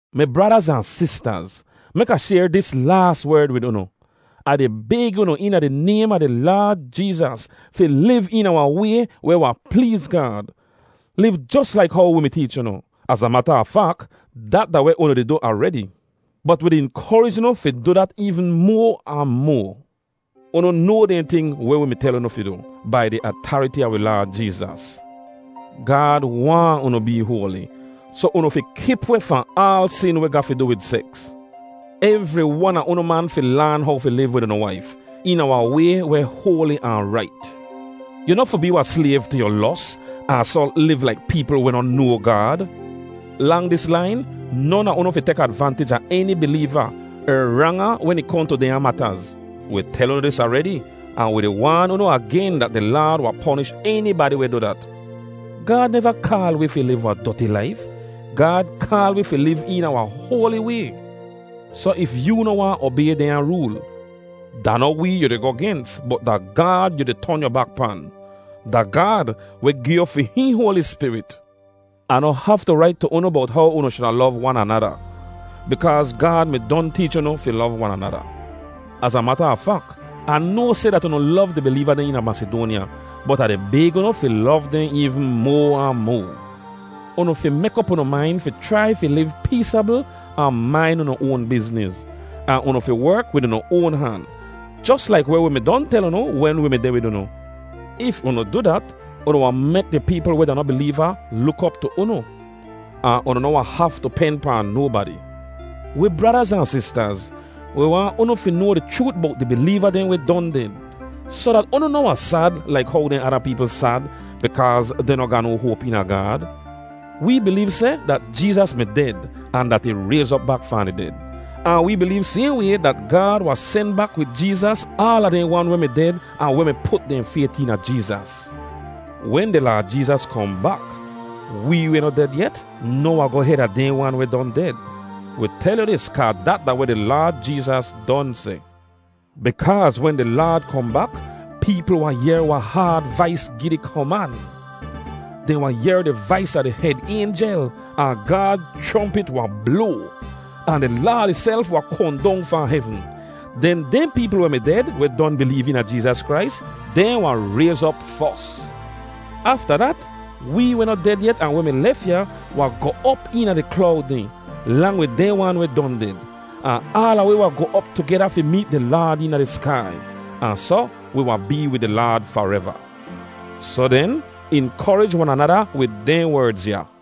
Mi bradaz ahn sistaz, mek Ah shayr dis laas werd wid unu. Ah di bayg unu eena di naym a di Laad Jeezas fi liv eena wahn way weh wahn pleez Gaad. Liv jos laik how wi mi teech unu. Az a mata a fak, dat da weh unu di du aredi. Bot wi di inkorij unu fi du dat eevn moa ahn moa. Unu noa dehn ting weh wi mi tel unu fi du, bai di atariti a wi Laad Jeezas. Gaad waahn unu bee hoali, soh unu fi kip weh fahn aal sin weh ga fi du wid seks. Evri wan a unu man fi laan how fi liv wid unu waif, eena wahn way weh hoali ahn rait. Yu noh fi bee wahn slayv tu yu los, ahn soh liv laik peepl weh noh noa Gaad. Lang dis lain, non a unu fi tek advantij a eni bileeva, er rang ahn wen ih kohn tu dehnya mataz. Wi tel unu dis aredi, ahn wi di waan unu agen dat di Laad wahn ponish enibadi weh du dat. Gaad neva kaal wi fi liv wahn doti laif. Gaad kaal wi fi liv eena wahn hoali way. Soh if yoo noh waahn obay dehnya rool, da noh wee yu di goh gens bot da Gaad yu di ton yu bak pan. Da Gaad weh gi yu fi hihn Hoali Spirit. Ah noh haftu rait tu unu bowt how unu shuda lov wan anada, bikaaz Gaad mi don teech unu fi lov wan anada. Az a mata a fak, Ah noa seh dat unu lov di bileeva dehn eena Masidoanya, bot Ah di bayg unu fi lov dehn eevn moa ahn moa. Unu fi mek op unu main fi chrai fi liv peesabl ahn main unu oan bizniz, ahn unu fi werk wid unu oan han, jos laik weh wi mi don tel unu wen wi mi deh wid unu. If unu du dat, unu wahn mek di peepl weh da noh bileeva luk op tu unu. Ahn unu noh wahn haftu pen pahn nobadi. Wi bradaz ahn sistaz, wi waahn unu fi noa di chroot bowt di bileeva dehn weh don ded, soh dat unu noh wahn sad laik how dehn ada peepl sad, bikaaz dehn noh ga no hoap eena Gaad. Wee bileev seh dat Jeezas mi ded ahn dat ih rayz op bak fahn di ded. Ahn wee bileev sayhn way dat Gaad wahn sen bak wid Jeezas aala dehn wan weh mi ded ahn weh mi put dehn fayt eena Jeezas. Wen di Laad Jeezas kohn bak, wee weh noh ded yet noh wahn goh hed a dehn wan weh don ded. Wi tel yu dis kaa dat da weh di Laad Jeezas don seh. Bikaaz wen di Laad kohn bak, peepl wahn yehr wahn haad vais gi di koman. Dehn wahn yehr di vais a di hed aynjel, ahn Gaad chrompit wahn bloa. Ahn di Laad ihself wahn kohn dong fahn hevn. Den dehn peepl weh mi ded weh don bileev eena Jeezas Krais, dehn wahn rayz op fos. Afta dat, wee weh noh ded yet ahn weh mi lef ya wahn goh op eena di klowd dehn, lang wid dehn wan weh don ded. Ahn aala wi wahn goh op tugeda fi meet di Laad eena di skai. Ahn soh wi wahn bee wid di Laad fareva. Soh den, inkorij wan anada wid dehn werdz ya.